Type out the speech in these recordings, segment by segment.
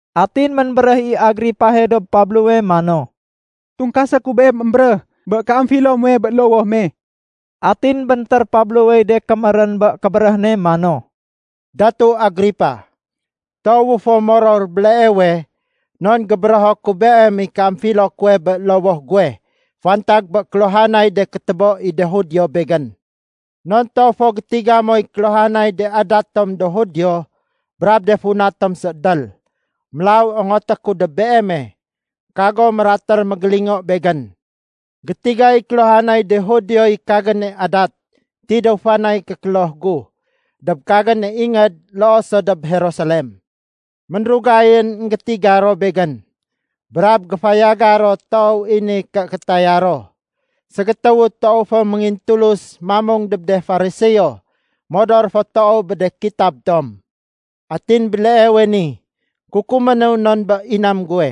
Atin ménbéréh i Agripahe dob Pablowe mano, “Tungkasé ku beem émbéréh bé kéamfilo muwe bé lowoh me.” Atin béntér Pablowey de kémérén bé kébéréh ne mano, “Datu Agripa, toowu fo moror béleewe non gébérého ku beem i kéamfilo kuwe bé lowoh guwe fantag bé kéluhanay de kétébo i de Judio begén. Non toow fo gétiga moy kéluhanay de adat tom do Judio brab de funa tom séédél. Mélaw ongoté ku dob beeme, kago mératér mégélingo begén. “Gétigay kéluhanay de Judioy kagéne adat tidéw fanay kékloh gu dob kagéne ingéd loo so dob Jerusalem. Ménrugayén énggétiga ro begén, brab géfayaga ro toow i ni ké kétaya ro, ségétéwu toow fo méngintulus mamung dob de Fariseo modor fo toow bé de kitab tom. Atin béleewe ni kukuménu non bé inam guwe,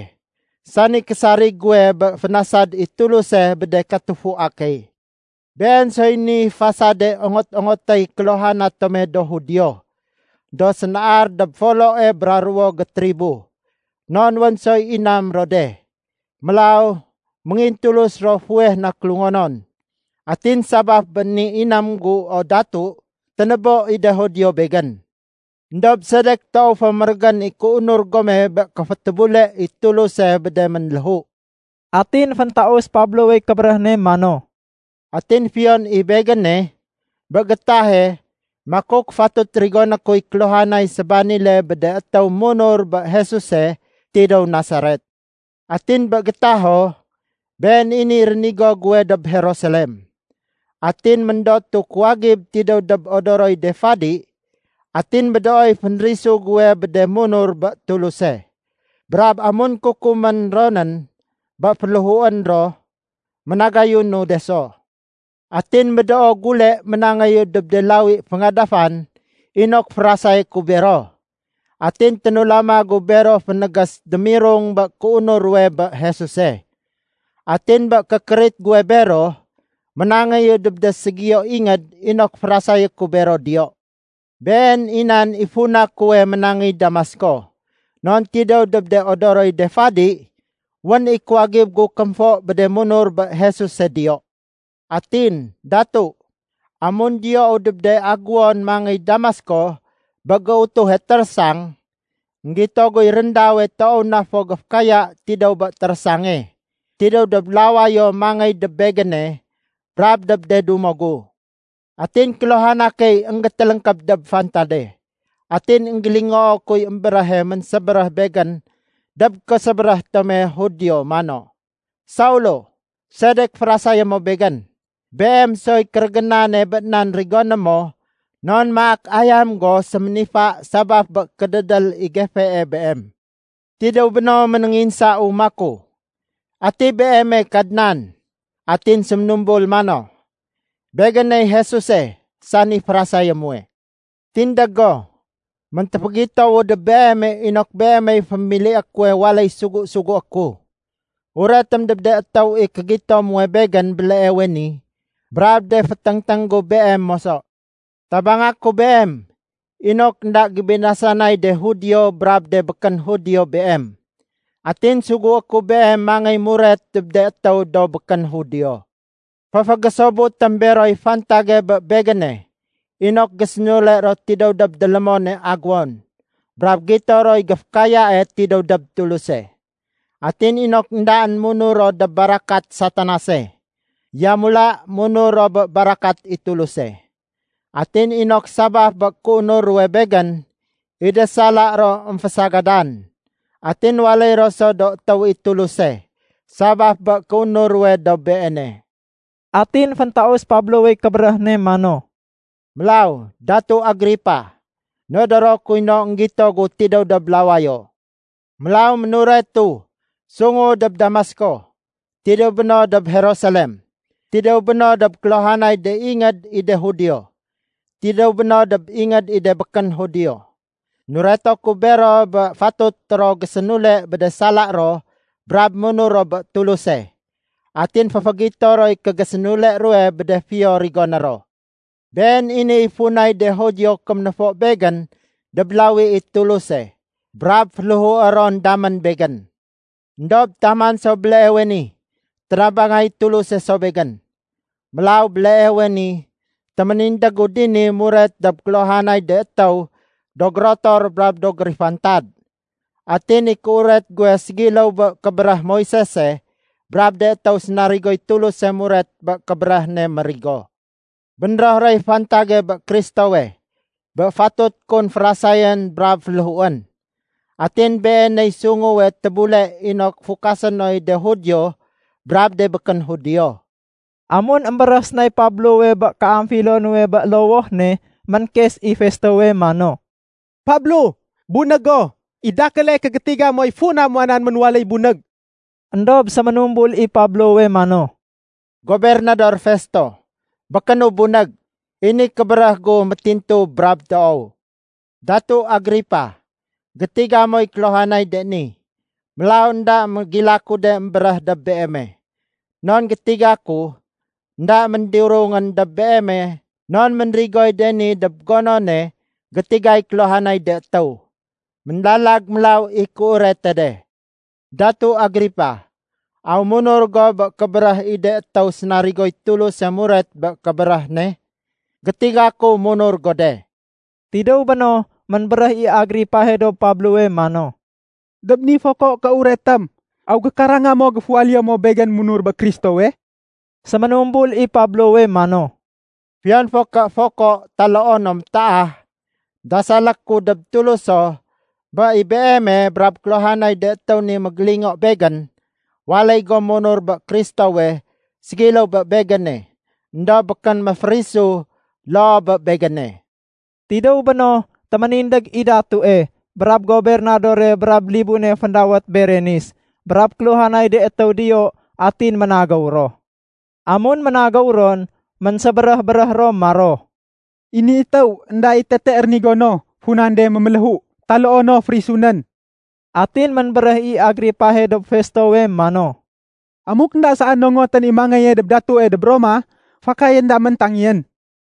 sani késarig guwe bé fénasad i Tuluse bé de katufua key. Been soy ni fasade ongot-ongotéy kéluhana tome do Judio, do sénaar dob foloe bra ruwo gétribo, non wén soy inam ro de. Mélaw méngintulus ro fuweh na kélungonon. Atin sabaf bé ni inam gu o Datu, ténébo i de Judio begén. Endob sedek toow fo mérégén i kéunur gome bé kéfétébule i Tuluse bé de ménléhu?” Atin féntaus Pablowey kébéréh ne mano, “Atin fiyon i begéne, bé gétahe makuk fatut rigoné kuy kéluhanay sébanile bé de étéw munur bé Jesuse tidéw Nasaret. Atin bé gétaho, been i niy rénigo guwe dob Jerusalem. Atin méndotu kuwagib tidéw dob odoroy de fadi atin médooy fénrisu guwe bé de munur bé Tuluse. Brab amun kukumén ronén bé féléhuén ro, ménagayunu de so. Atin médoo gule ménangéyu dob de lawi féngadafan inok férasayé ku bero. Atin ténulama gu bero fénégés démirung bé kéunur ruwe bé Jesuse. Atin bé kékérit guwe bero ménangéyu dob de ségiyo ingéd inok férasayé ku bero diyo. “Been i nan i funa kuwe ménangéy Damasko, non tidéw dob de odoroy de fadi, wén i kuwagib gu kémfo bé de munur bé Jesuse diyo. Atin, Datu, amun diyou dob de agéwon mangéy Damasko bé géutuhe térésang, énggito guy réndawe toow na fo géfékaya tidéw bé térésange, tidéw dob lawayo mangéy dob begéne brab dob de dumo gu. Atin kéluhana key énggétéléngkéb dob fantade. Atin énggélingoo kuy émbéréhe ménsébéréh begén dob késébéréh tome Judio mano, ‘Saulo! Sedek férasayé mo Begén? Beem soy kérégénane bé nan rigoné mo non maak ayam go séménifa sabaf bé kédédél i gefee beem.’ Tidéw béno ménénginsau maku, ‘Ati Beeme, Kadnan?’ Atin séménumbul mano, ‘Begéney Jesuse sani férasayé muwe. Tindég go! Méntéfégitowu dob beeme inok beemey fémilié kuwe waléy sugu-sugué ku. Uretém dob de étéw i kégito muwe Begén béleewe ni brab de féténgténg gu beem moso. Tabanga ku beem inok énda gébinasanay de Judio brab de békén Judio beem. Atin sugué ku beem mangéy muret dob de étéw do békén Judio. Féfégésobutém beroy fantage bé Begéne inok gésénule ro tidéw dob délémone agéwon brab gito roy géfékayae tidéw dob Tuluse. Atin inok éndaén munur ro dob barakat Satanase, yamula munur ro bé barakat i Tuluse. Atin inok sabaf bé kéunur ruwe Begén i de sala ro émfasagadan, atin waléy ro so do étéw i Tuluse sabaf bé kéunur ruwe dob Beene.’” Atin féntaus Pablowey kébéréh ne mano, “Mélaw Datu Agripa, nodoro kuy no énggito gu tidéw dob lawayo. Mélaw ménuretu sungu dob Damasko, tidéw béno dob Jerusalem. Tidéw béno dob kéluhanay de ingéd i de Judio, tidéw béno dob ingéd i de békén Judio. Nureto ku bero bé fatut ro gésénule bé de sala ro brab munur ro bé Tuluse. Atin féfégito roy kégésénule ruwe bé de fiyo rigoné ro. Been i niy funay de Judio kéménéfo begén dob lawi i Tuluse brab féléhué ron damén begén. Endob taman so béleewe ni, ténabangay Tuluse so begén. Mélaw béleewe ni téménindégu dini muret dob kéluhanay de étéw do gérotor brab do gérifantad. Atin i kéuret guwe ségiléw bé kébéréh Moisese brab de étéw sénarigoy Tuluse muret bé kébéréh ne mérigo. Bénréh roy fantage bé Kristowe, bé fatut kun férasayén brab féléhuén. Atin Beeney sunguwe tébule inok fukasé noy de Judio brab de békén Judio.” Amun émbéréh sénay Pablowe bé kéamfilo nuwe bé lowoh ne, ménkes i Festowe mano, “Pablo, bunég go! I dakéle kégétiga moy funa muwanan ménwaléy bunég.” Endob séménumbul i Pablowe mano, “Gobernador Festo, békénu bunég. I ni kébéréh gu métintu brab toow. Datu Agripa, gétiga moy kéluhanay de ni. Mélaw énda mégilaku de émbéréh dob beeme. Non gétiga ku, énda méndirungén dob beeme non ménrigoy de ni dob gonone gétigay kéluhanay de étéw. Ménlalag mélaw i kéurete de. Datu Agripa, aw munur go bé kébéréh i de étéw sénarigoy Tuluse muret bé kébéréh ne? Gétiga ku munur go de.” Tidéw béno ménbéréh i Agripahe dob Pablowe mano, “Dob ni foko kéuretém, aw gékaranga mo géfuwaléyo mo begén munur bé Kristowe?” Séménumbul i Pablowe mano, “Fiyon fo ké foko taloo no métaah, dasalé ku dob Tuluso bé i beeme brab kéluhanay de étéw ni mégélingo begén, waléy gom munur bé Kristowe ségiléw bé begéne éndob békén méférisu loo bé begéne.” Tidéw béno téménindég i datue, brab gobernadore brab libune féndawét Berenis brab kéluhanay de étéw diyo atin ménagéw ro. Amun ménagéw ron, ménsébéréh-béréh ro maro, “I ni étéw, énda i tete rénigo no funan de méméléhu taloo no férisunén.” Atin ménbéréh i Agripahe dob Festowe mano, “Amuk énda saén nongotén i mangéye dob datue dob Roma, fakayén damén tangeyén.”